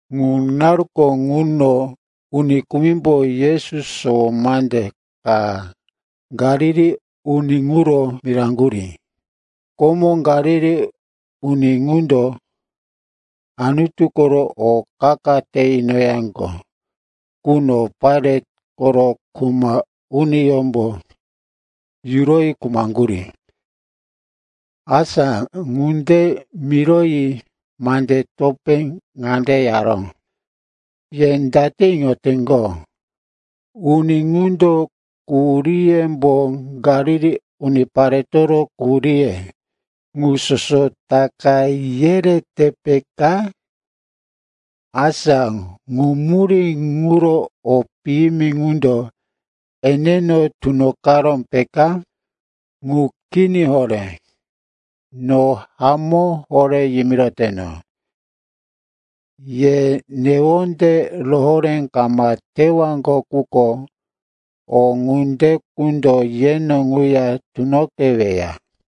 Ŋu naruko ŋuno uni kumimbo Yesu sowo mande ka Galili uni ŋuro miraŋgurí. Komo Galili uni ŋundo Anutu koro o qa-qa te inoyaŋgo quno Pailat koro kuma uniyómbo yuroyi khumaŋgurí. Asa ŋunde miroyi mande topé ŋande yaró, “Ye date iŋoteŋgo, uni ŋundo quhuríyembo Galili uniparetoro quhuríye ŋu soso taka yerete, peka? Asa ŋu murí ŋuro o piyimi ŋundo eneno tunoqaró, peka? Ŋu kini horé. No hamó horé yimiroteno, ye newonde rohoré kama tewaŋgo quko, o ŋunde qundo yeno ŋuya tunoqeweya.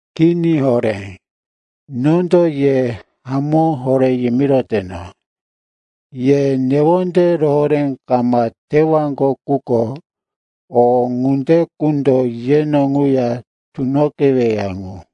Kini horé. Nondo ye hamó horé yimiroteno, ye newonde rohoré kama tewaŋgo quko, o ŋunde qundo yeno ŋuya tunoqeweya ŋu.”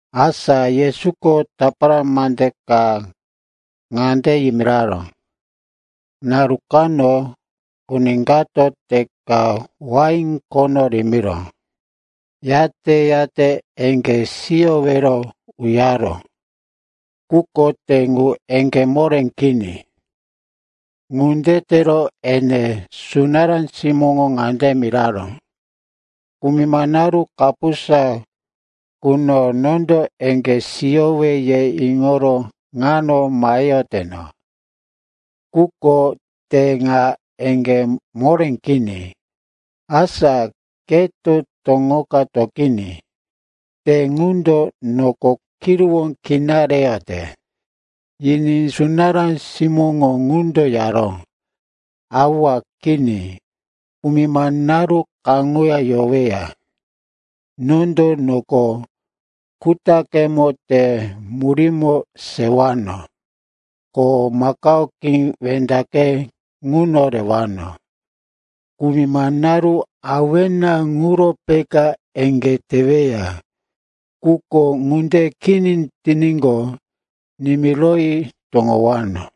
Asa Yesuko tapara mande ka ŋande yimiraró, “Naru kano uni kato te ka wain khono rimiró. Yate-yate eŋgé siyowero uyaró, quko te ŋu eŋgé moré kini. Ŋunde tero ene sunará simóŋo ŋande miraró, ‘Kumima naru kapusa quno nondo eŋgé siyowe, ye iŋoro ŋano maheyoteno. Quko te ŋa eŋgé moré kini. Asa keto toŋoka toqiní. Te ŋundo noko kiruwó kina reyote.’ “Yiní sunará simóŋo ŋundo yaró, ‘Awa, kini. Kumima naru kaŋuya yoweya. Nondo noko kutaqemo te murímo sewano, ko makao qí wendaqe ŋuno rewano. Kumima naru awena ŋuro peka eŋgé teweya. Quko ŋunde kini tiníqo, nimiroyi toŋowano.’”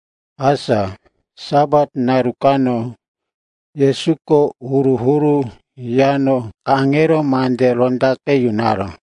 Asa Sapat naru kano Yesuko huru-huru yano kaŋero mande rondaqe yunoyaró.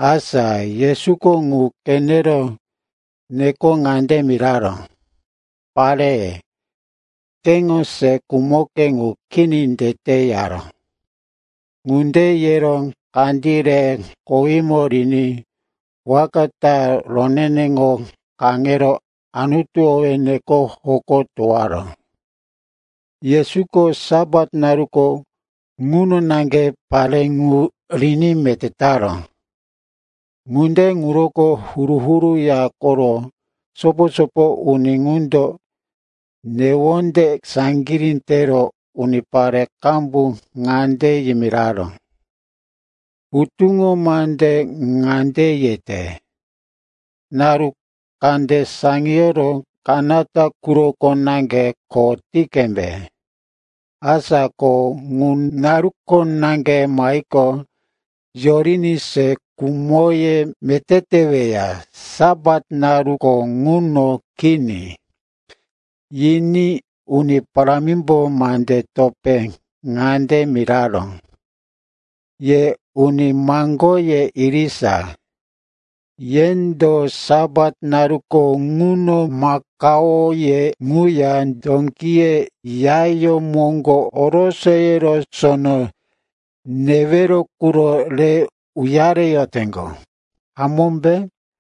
Asa Yesuko ŋu qenero nekoro ŋande miraró, “Pare, keŋo se khumoke ŋu kini tete,” yaró. Ŋunde yero kandí rero kowímo riní waka ta roneneŋo kaŋero Anutu owí neko hoko towoyaró. Yesuko Sapat naruko ŋuno naŋge pare ŋu riní meté taró. Ŋunde ŋuroko huru-huru ya koro sopo-sopo uni ŋundo newonde saŋgirí tero unipare qambu ŋande yimiraró, “Hutuŋo mande ŋande yete, naru kande saŋiyoro kanata quroko naŋge kho ti qembe. Asa ko ŋu naruko naŋge mahiqo, yoriní se khumoye meté teweya, Sapat naruko ŋuno kini.” Yiní Uni Parámimbo mande topé ŋande miraró, “Ye uni maŋgoye irisa. Yendo Sapat naruko ŋuno makaoye ŋuya dókiye yayó moŋgo orosoyero sono newero quro re uyareyoteŋgo, hamómbe?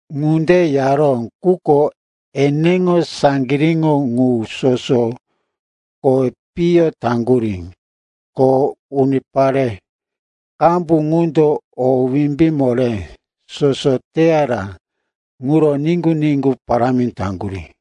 Ŋunde yaró, quko eneŋo saŋgiríŋo ŋu soso kowi piyo taŋgurí. Ko unipare qambu ŋundo o wimbí moré soso teyara ŋuro niŋgu-niŋgu parámi taŋgurí.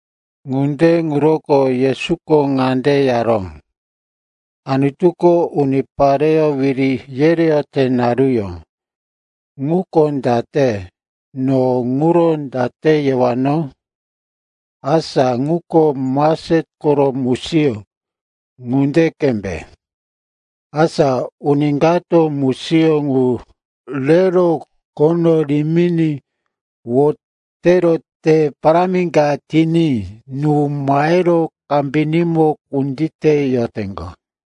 Ŋunde ŋuroko Yesuko ŋande yaró, “Anutuko unipareyó wiri yereyote naruyó ŋuko date, no ŋuro date yewano? Asa ŋuko mastet koro musiyó ŋunde qembe. Asa uni kato musiyó ŋu rero khono riminí wotero te parámi ka tiní nú mahero kambinímo kunditeyoteŋgo.”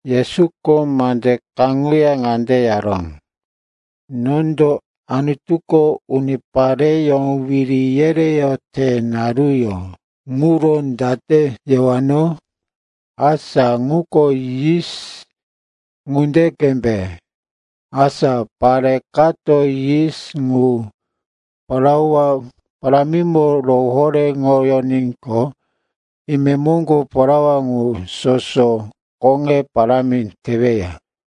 Yesuko mande kaŋuya ŋande yaró, “Nondo Anutuko unipareyó wiri yereyote naruyó ŋuro date yewano? Asa ŋuko yis ŋunde qembe. Asa pare kato yis ŋu plaua parámimo rohoréŋoyoníqo, imemoŋgo plaua ŋu soso koŋe parámi teweya.”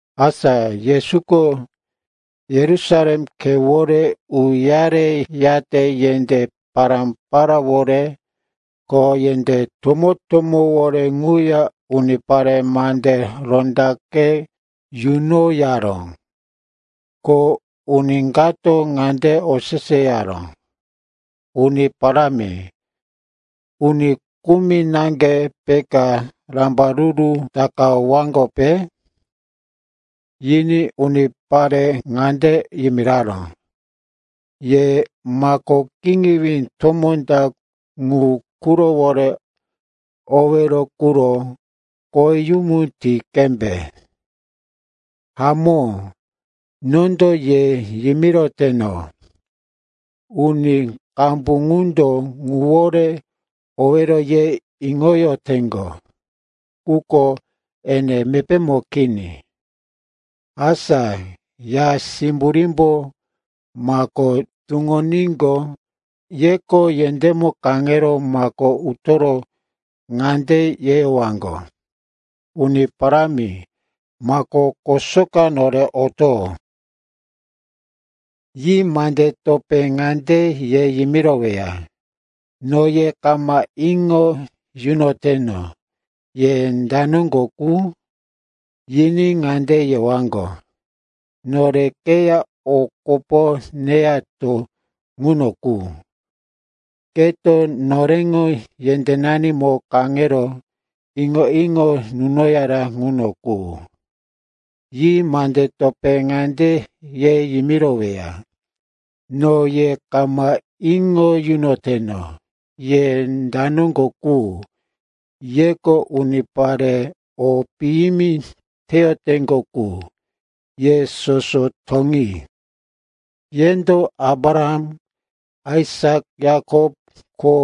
Asa Yesuko Yerusalem khewore uyareyate yendé pará-paráwore ko yendé tomó-tomówore ŋuya unipare mande rondaqe yunoyaró. Ko uni kato ŋande oseseyaró, “Uni Parámi, uni kumi naŋge peka rambaruru takawaŋgope?” Yiní unipare ŋande yimiraró, “Ye mako kiŋiwí tomó ta ŋu qurowore owero quro koweyumu ti qembe. Hamó, nondo ye yimiroteno, uni qambu qundo ŋuwore owero ye iŋoyoteŋgo, quko ene mepémo kini. Asa ya simburímbo mako tuŋoníqo, yeko yendémo kaŋero mako utoro ŋande yeyowaŋgo, ‘Uni Parámi, mako kosoka nore oto.’ “Yi mande topé ŋande ye yimiroweya, ‘No ye kama iŋo yunoteno, ye da noŋgo qu.’ “Yiní ŋande yewaŋgo, ‘Nore keya o kopo neyato ŋuno qu, keto noreŋo yendénanimo kaŋero iŋo-iŋo nunoyara ŋuno qu.’ “Yi mande topé ŋande ye yimiroweya, ‘No ye kama iŋo yunoteno, ye da noŋgo qu. Yeko unipare o piyimi teyoteŋgo qu, ye soso toŋi.’ “Yendo Abraham, Aisak, Yakop ko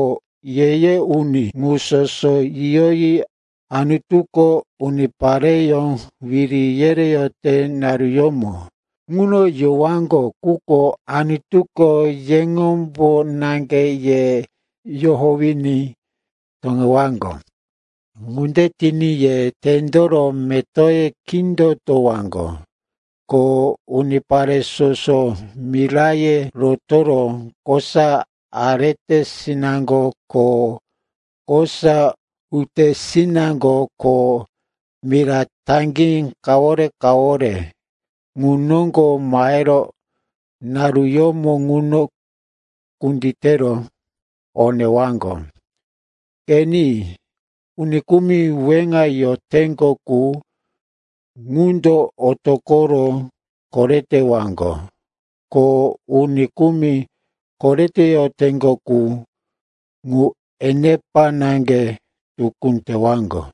ye-ye uni ŋu soso yiyoyi Anutuko unipareyó wiri yereyote naruyómo ŋuno yowaŋgo, quko Anutuko yeŋombo naŋge ye yohowiní toŋewaŋgo. Ŋunde tiní ye tendoro metoye kindotowaŋgo. Ko unipare soso miraye rotoro kosa aretesinaŋgo ko kosa utesinaŋgo ko mira taŋgí kawore-kawore ŋu noŋgo mahero naruyómo ŋuno kunditero o newaŋgo. Qeni, uni kumi weŋa yoteŋgo qu, ŋundo otoqoro koretewaŋgo. Ko uni kumi koreteyoteŋgo qu, ŋu enepa naŋge tukú tewaŋgo.”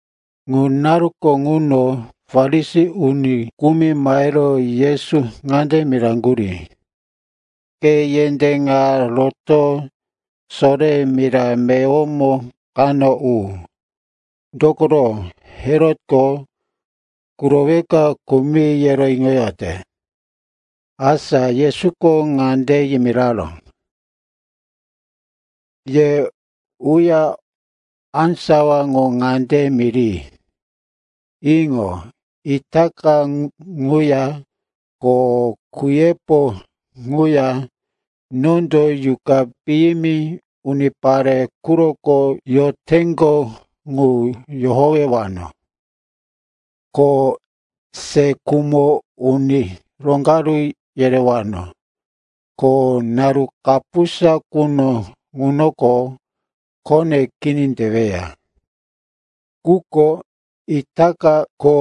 Ŋu naruko ŋuno Farisi uni kumi mahero Yesu ŋande miraŋgurí, “Ke yendé ŋa roto soreya mira meyowo kano u. Dokoro, Herotko kuroweka khumi, yero iŋoyote.” Asa Yesuko ŋande yimiraró, “Ye uya, á sawa ŋu ŋande miri, ‘Iŋo, itaka ŋuya ko kuyepo ŋuya nondo yuqa piyimi unipare quroko yoteŋgo ŋu yohowewano, ko se khumo uni roŋgaru yerewano. Ko naru kapusa quno ŋunoko khone kini teweya.’ Quko itaka ko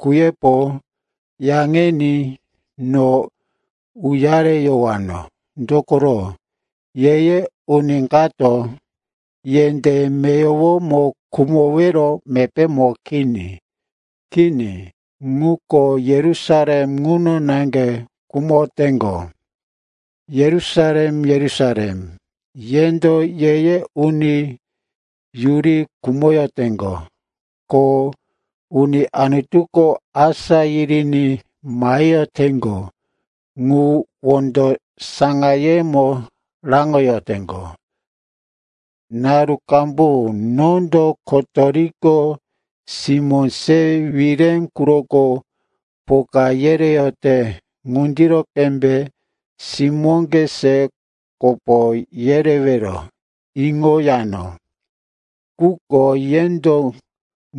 kuyepo, yaŋini no uyareyowano. Dokoro ye-ye uni kato yendé meyowomo khumowero mepémo kini. Kini, ŋuko Yerusalem ŋuno naŋge khumoteŋgo! “Yerusalem, Yerusalem, yendo ye-ye uni yuri khumoteŋgo, ko uni Anutuko asá yiriní maheyoteŋgo ŋu wondo saŋayemo raŋoyoteŋgo. Naru qambu nondo kotoriko simó se wire quroko poka yereyote ŋunde qembe simóŋge se kopo yerewero iŋoyano. Quko yendo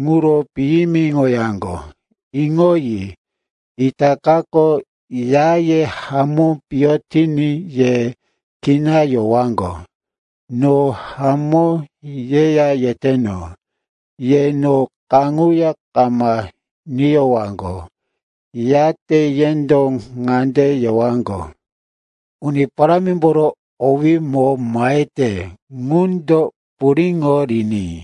ŋuro piyimiŋoyaŋgo. Iŋoyi, itakako yaye hamó piyo tiní ye kina yowaŋgo. No hamó yeya yeteno, ye no kaŋuya kama niyowaŋgo, yate yendo ŋande yewaŋgo, ‘Uni Parámimboro owímo mahete ŋundo puriŋo riní.’”